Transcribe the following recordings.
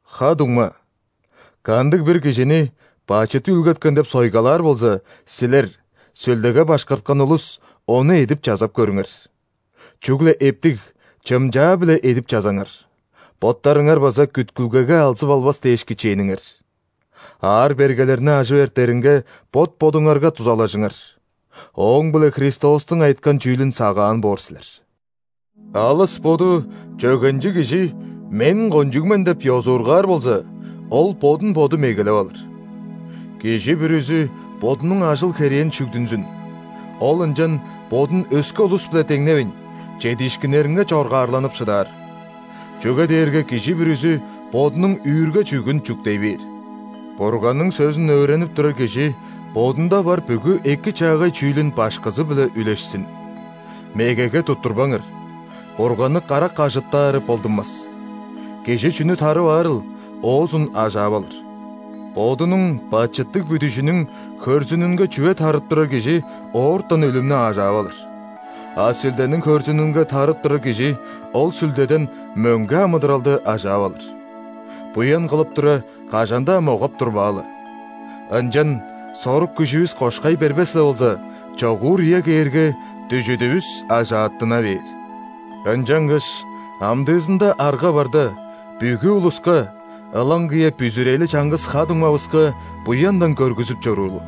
Ха-дуңма, кандыг-бир кижини бачыт үүлгеткен деп сойгалаар болза, силер, Сүлдеге башкарткан улус, ону эдип-чазап көрүңер. Чүгле эптиг, чымчаа-биле эдип-чазаңар, боттарыңар база күткүлгеге алзып албас дээш кичээниңер. Аар-бергелерни ажып эртеринге бот-бодуңарга дузалажыңар, ооң-биле Христостуң айыткан чүүлүн сагаан боор силер. Алыс боду чөгенчиг кижи «Мен кончуг мен» деп ёзуургаар болза, ол бодун боду мегелеп алыр. Кижи бүрүзү бодунуң ажыл-херээн шүгдүнзүн, ол ынчан бодун өске улус-биле деңневейн, чедиишкиннеринге чоргаарланып шыдаар. Чүге дээрге кижи бүрүзү бодунуң үүрге-чүъгүн чүктей бээр. Бурганның сөзүн өөренип турар кижи бодунда бар бүгү эки-чаагай чүүлүн башкызы-биле үлешсин. Мегеге туттурбаңар: Бурганны карак ажыттаары болдунмас. Кижи чүнү тарып аарыл, оозун ажаап алыр. Бодунуң бачыттыг бүдүжүнүң хөрзүнүнге чүве тарып турар кижи оортан өлүмнү ажаап алыр. А Сүлдениң хөрзүнүнге тарып турар кижи ол Сүлдеден мөңге амыдыралды ажаап алыр. Буян кылып тура, кажан-даа могап-турбаалы. Ынчан, сорук-күжүвүс кошкай бербес-ле болза, чогуур үе кээрге, дүжүдүвүс ажааттына бээр. Ынчангаш амдыызында арга барда, бүгү улуска, ылаңгыя бүзүрели чаңгыс ха-дуңмавыска, буяндан көргүзүп чоруулу.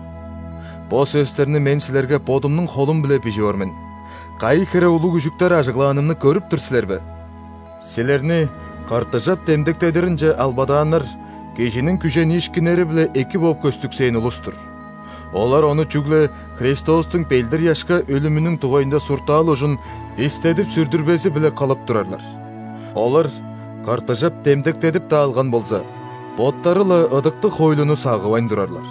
Бо сөстерни мен силерге бодумнуң холум-биле бижип ор мен, кайы хире улуг үжүктер ажыглаанымны көрүп тур силер бе? Силерни ·кыртыжап демдектедиринче албадааннар – кижиниң күжениишкиннери-биле эки бооп көстүксээн улус-тур. Олар ону чүгле Христостуң ·белдир-ыяшка өлүмүнүң дугайында суртаал ужун истедип-сүрдүрбези-биле кылып турарлар. Олар кыртыжап демдектедип-даа алган болза, боттары-ла ыдыктыг хоойлуну сагывайн турарлар.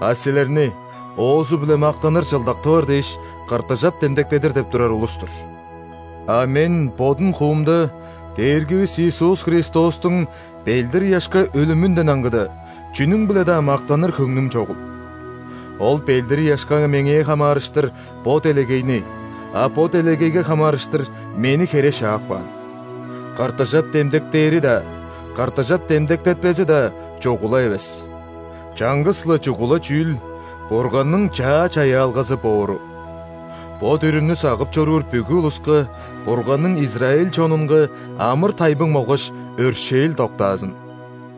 А силерни, оозу-биле мактаныр чылдак тывар дээш, кыртыжап демдектедир деп турар улус-тур. А мен бодум хуумда Дээргивис Иисус Христостуң белдир-ыяшка өлүмүнден аңгыда, чүнүң-биле-даа мактаныр хөңнүм чогул. Ол белдир-ыяшка меңээ хамаарыштыр – бо делегейни, а бо делегейге хамаарыштыр – мени хере шаап каан. ·Кыртыжап демдектээри-даа, кыртыжап демдектетпези-даа чугула эвес. Чаңгыс-ла чугула чүүл – Бурганның чаа чаяалгазы боору! Бо дүрүмнү сагып чоруур бүгү улуска, Бурганның израиль чонунга амыр-тайбың болгаш өршээл доктаазын!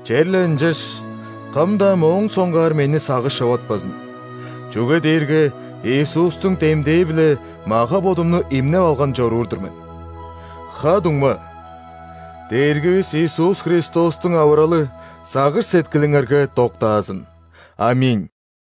Черле ынчаш, кым-даа моон соңгаар мени сагыш човатпазын, чүге дээрге Иисустуң демдээ-биле мага-бодумну имнеп алган чоруур-дур мен. Ха-дуңма, Дээргивис Иисус Христостуң авыралы сагыш-сеткилиңерге доктаазын! ·Аминь.